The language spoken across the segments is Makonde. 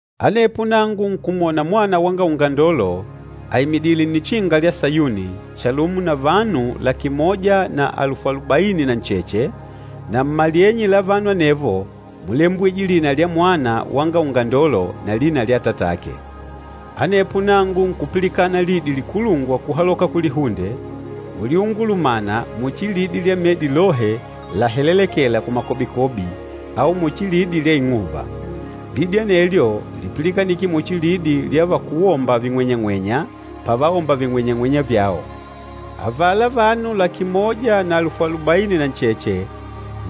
Anepo nangu nkumwona Mwana wanga Ungandolo aimidìlè Nnichinga lya Sayuni, chalumo na vanu laki moja na alufu alubaini na ncheche, na mmalyenye la vanu anevo múlembwije lina lya Mwana wanga Ungandolo na lina lya Atatake. Anepo nangu nkupilikana lidi likulungwa kuhaloka kulihunde, uliungulumana muchi lidi lya medi lohe lahelelekêla kumakobikobi au muchi lidi lya ing'uva. Lidi anelyo lípilikanike muchi lidi vya vakúwomba ving'wenyang'wenya pavaomba ving'wenyang'wenya vyao. Avala vanu laki moja na alufu alubaini na ncheche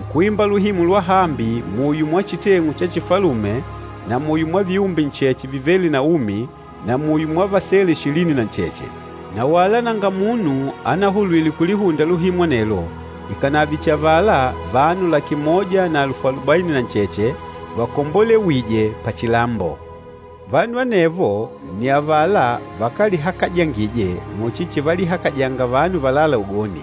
nkuimba luhimu lwahambi muyo mwa chiteng'u cha chifalume na muyo mwa viumbe ncheche vivêle na umi na muyo mwa vasele ishilini na ncheche. Na wala nanga munu anahulwile kulihunda luhimu anelwo, ikànave chihi avala vanu laki moja na alufu alubaini na ncheche vakombolewîje pachilambo. Vanu anevo nni avala vakálihakajangije muchi chivalihakajanga vanu valâla ugoni,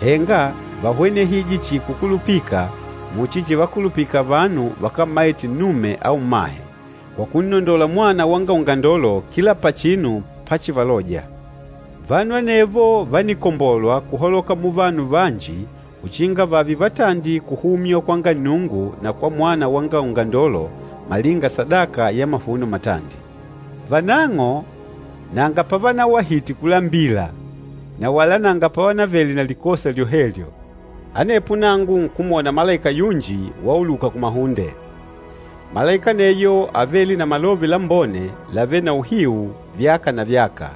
henga váhwenehije chihi kukulupika muchi chivakulupika vanu vakámmaite nnume au mmahe, kwa kunnondola Mwana wanga Ungandolo kila pachinu páchivalòjà. Vanu anevo vánikombolwa kuhaloka muvanu vanji uchinga vààve vatandi kuhumywa kwanga Nnungu na kwa Mwana wanga Ungandolo malinga sadaka ya mavuno matandi. Vanang'o nanga pavanawahite kulambila na wala nanga pavanavele na likosa lyohelyo. Anepo nangu nkumwona malaika yunji wauluka kumahunde. Malaika aneyo ávele na Malove Lambone lavêle na uhiu vyaka na vyaka,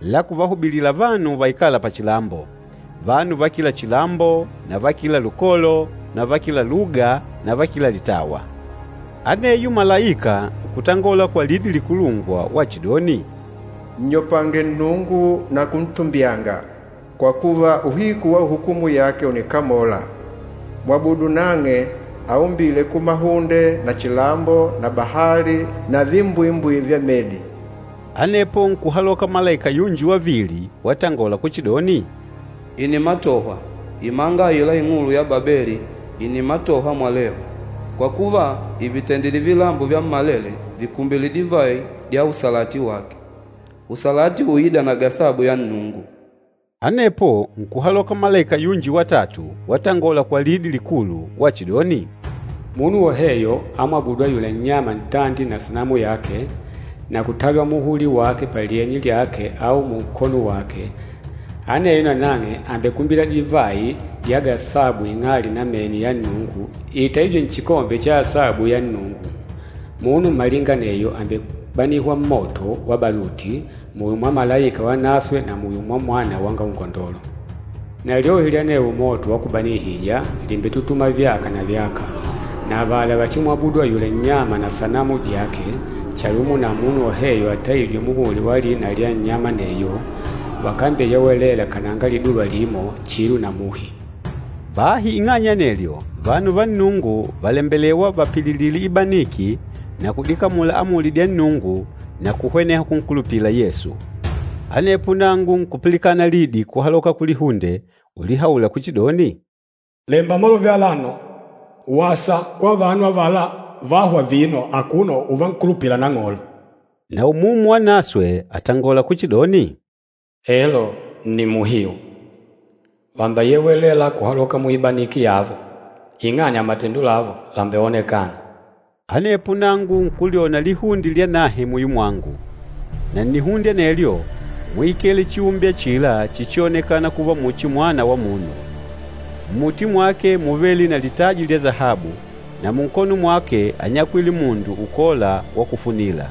la kuvahubilila vanu vaikâla pachilambo, vanu va kila chilambo na va kila lukolo na va kila luga na va kila litawa. Aneyo malaika nkutangola kwa lidi likulungwa wachidoni, “Nnyopange Nnungu na kuntumbyanga, kwa kuva, uhiku wa hukumu yake ùnikamola. Mwabudu nang'e aumbîle kumahunde na chilambo na bahali na dimbwimbwi dya medi.” Anepo nkuhaloka malaika yunji wavili watangola kuchidoni, “Ìnimatohwa! Imanga aila ing'ulu ya Babeli ìnimatohwa mwalehu. Kwa kuva, ìvitendile vilambo vyammalele vikumbile divayi dya usalati wake, usalati uîda na gasabu ya Nnungu.” Anepo nkuhaloka malaika yunji watatu watangola kwa lidi likulu wachidoni, “Munu woheyo amwabûdu ayula nnyama ntandi na sanamu yake, na kutaywa muhuli wake palyenye lyake au munkono wake, aneyo nanang'e àmbekumbila divayi dya gasabu ing'ali namene ya Nnungu itaîjwe nchikombe cha asabu ya Nnungu. Munu malinga aneyo àmbebanihwa mmoto wa baluti, muyo mwa malaika vanaswe na muyo mwa Mwana wanga Ungandolo. Na lyohi lya anewo moto wa kubanihija lìmbetutuma vyaka na vyaka. Na avala vachimwabudu ayula nnyama na sanamu dyake, chalumo na munu woheyo ataîjwe muhuli wa lina lya nnyama aneyo, vakambeyewelela kananga liduva limo, chilo na muhi.” Bahi ing'anya ya anelyo, vanu va Nnungu vàlembelewa vapililile ibaniki na kudikamula amuli dya Nnungu na kuhweneha kunkulupila Yesu. Anepo nangu nkupilikana lidi kuhaloka kulihunde ulihaula kuchidoni, “Lemba malove alano, ‘Wasa kwa vanu avala vâhwa vino akuno uvankulupila Nang'olo!’” Na Umumu Wanaswe àtangola kuchidoni, “Elo, nni muhiu. Vàmbeyewelela kuhaloka muibaniki yavo, ing'anya matendo lavo làmbeonekana.” Anepo nangu nkulyona lihunde lyanahe muyo mwangu, na nnihunde anelyo múikele chiumbe achila chíchionekana kuva muchi Mwana wa Munu. Mmuti mwake múvele na litaji lya sahabu, na munkono mwake ányakwile mundu ukôla wa kufunila.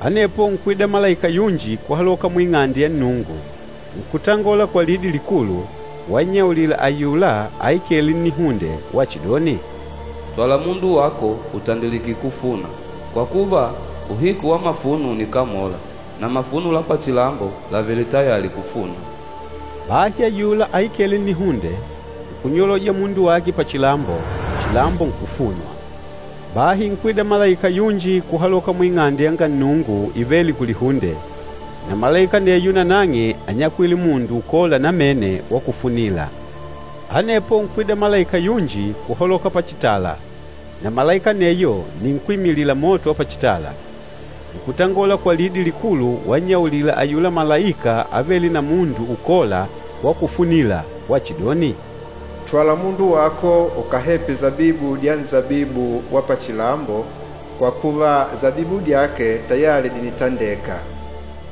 Anepo nkwida malaika yunji kuhaloka mu Ing'ande ya Nnungu, nkutangola kwa lidi likulu wannyaulila ayula aikêle nnihunde wachidoni, “Twala mundu wako utandilike kufuna, kwa kuva, uhiku wa mafuno ùnikamola, na mafuno la pachilambo làvele tayali kufunwa.” Bahi ayula aikêle nnihunde, nkunyoloja mundu wake pachilambo, chilambo nkufunwa. Bahi nkwida malaika yunji kuhaloka mu Ing'ande yanga Nnungu ivêle kulihunde, na malaika aneyo nanang'e ányakwile mundu ukôla namene wa kufunila. Anepo nkwida malaika yunji kuhaloka pachitala, na malaika aneyo nni nkwímilila moto wa pachitala. Nkutangola kwa lidi likulu wannyaulila ayula malaika avêle na mundu ukôla wa kufunila wachidoni, “Twala mundu wako ukahepe sabibu dya nsabibu wa pachilambo, kwa kuva, sabibu dyake tayali dìnitandeka.”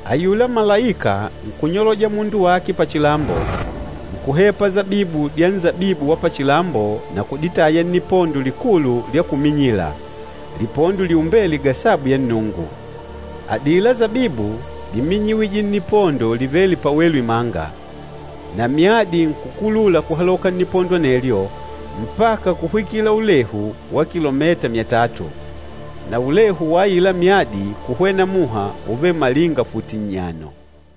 Ayula malaika nkunyoloja mundu wake pachilambo, nkuhepa sabibu dya nsabibu wa pachilambo na kuditaya nnipondo likulu lya kuminyila, lipondo liombêle gasabu ya Nnungu. Adila sabibu díminyiwije nnipondo livêle pawelu imanga, na myadi nkukulula kuhaloka nnipondo anelyo mpaka kuhwikila ulehu wa kilometa myatatu. Na ulehu wa aila myadi kuhwena muha úvele malinga futi nnyano.